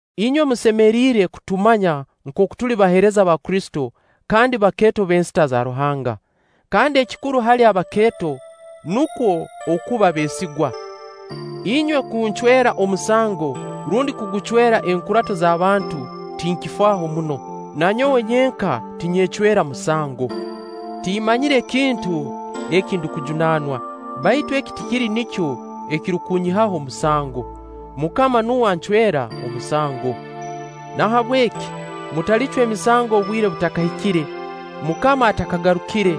Inywe musemiriire kutumanya nkooku tuli baheereza ba Kristo kandi bakeeto b'ensita za Ruahanga. Kandi ekikuru hali abakeeto nukwo okuba beesigwa. Inywe kuncwera omusango rundi kugucwerwa Enkurato z'abantu, tinkifaaho muno. Na nyowe nyenka tinyecwera musango. Timmanyire kintu eki ndukujunaanwa, baitu eki tikiri nikyo ekirukunyihaho musango. MUKAMA nuwe ancwera omusango. Nahabweki mutalicwa emisango obwire butakahikire, MUKAMA atakagarukire,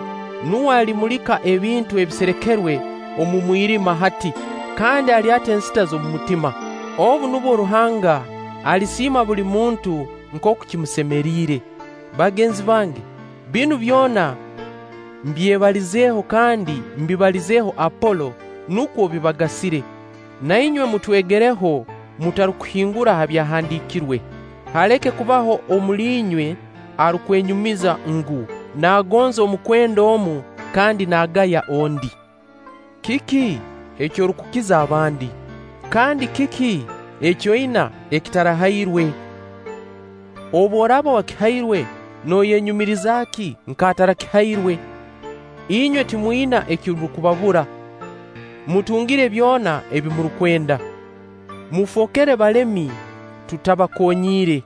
nuwe alimulika ebintu ebiserekerwe omu mwirima hati, kandi alyata ensita z'omutima. Obu nubwo Ruhanga alisiima buli muntu nkooku kimusemeriire. Bagenzi bange, binu byona mbyebalizeeho kandi mbibalizeeho Apolo nukwo bibagasire. Na inywe mutwegereho mutarukuhingura ha Byahandiikirwe, haleke kubaho omuli inywe arukwenyumiza ngu, naagonza omukwenda omu kandi naagaya ondi. Kiki eki orukukiza abandi? Kandi kiki eki oina eki otarahairwe? Obu oraaba wakihairwe, nooyenyumiriza ki nk'atarakihairwe? Inywe timwina ekirukubabura! Mutungire byona ebi murukwenda! Mufookere balemi tutabakonyiire!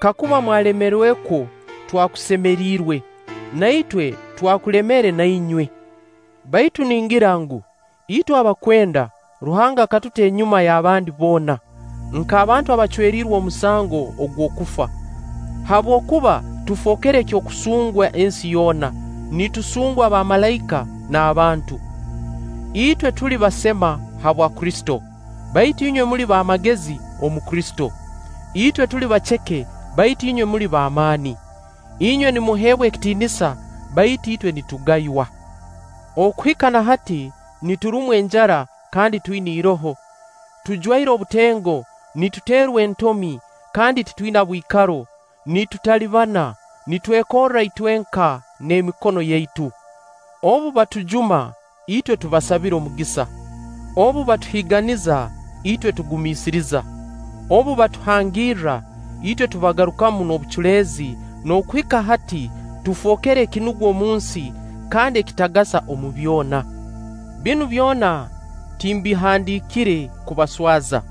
Kakuba mwalemerekwo, twakusemiriirwe, na itwe twakulemere na inywe. Baitu ningira ngu, itwe abakwenda Ruhanga akatuta enyuma y'abandi boona, nk'abantu abaacweriirwe omusango ogw'okufa, habwokuba tufookere eky'okusungwa ensi yoona, nitusungwa abamalaika n'abantu. Itwe tuli basema habwa Kristo, baitu inywe muli b'amagezi omu Kristo. Itwe tuli baceke, baitu inywe muli b'amaani. Inywe nimuheebwa ekitiinisa, baitu itwe nitugaywa. Okuhika na hati niturumwa enjara kandi twina iroho, tujwaire obutengo, nituterwa entomi, kandi titwina bwikaro, nitutalibana, nitwekorra itwenka n'emikono yaitu. Obu batujuma, itwe tubasabira omugisa; obu batuhiiganiza, itwe tugumiisiriza; obu batuhangirra, itwe tubagarukamu n'obuculeezi; n'okuhika hati tufookere ekinugwa omunsi kandi ekitagasa omu byona. Binu byona timbihandiikire kubaswaza,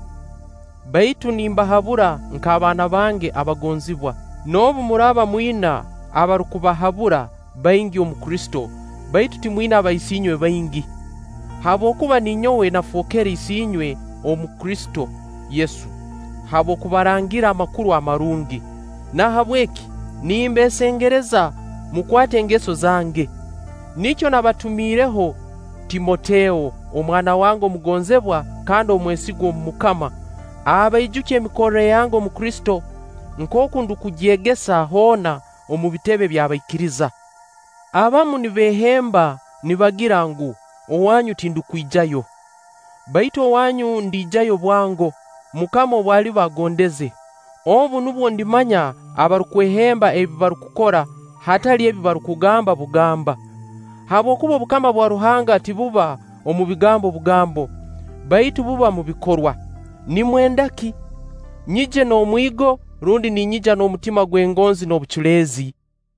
baitu nimbahabura nk'abaana bange abagonzibwa. Noobu muraaba mwina abarukubahabura baingi omu Kristo, baitu timwina baisiinywe baingi. Habwokuba ninyowe nafookere isiinywe omu Kristo Yesu habw'okubarangirra Amakuru Amarungi. Nahabweki nimbeesengereza, mukwate engeso zange. Nikyo nabatumiireho Timoteo, omwana wange omugonzibwa kandi omwesigwa omu MUKAMA, abaijukye emikorre yange omu Kristo, nkooku ndukugyegesa hoona omu bitebe by'abaikiriza. Abamu nibeehemba nibagira ngu, owanyu tindukwijayo. Baitu owanyu ndiijayo bwango, MUKAMA obu aliba agondeze; obu nubwo ndimanya abarukwehemba ebi barukukora, hatali ebi barukugamba bugamba. Habwokuba obukama bwa Ruhanga tibuba omu bigambo bugambo, baitu buba omu bikorwa. Nimwenda ki? Nyije n'omwigo, rundi nyije n'omutima gw'engonzi n'obuculeezi?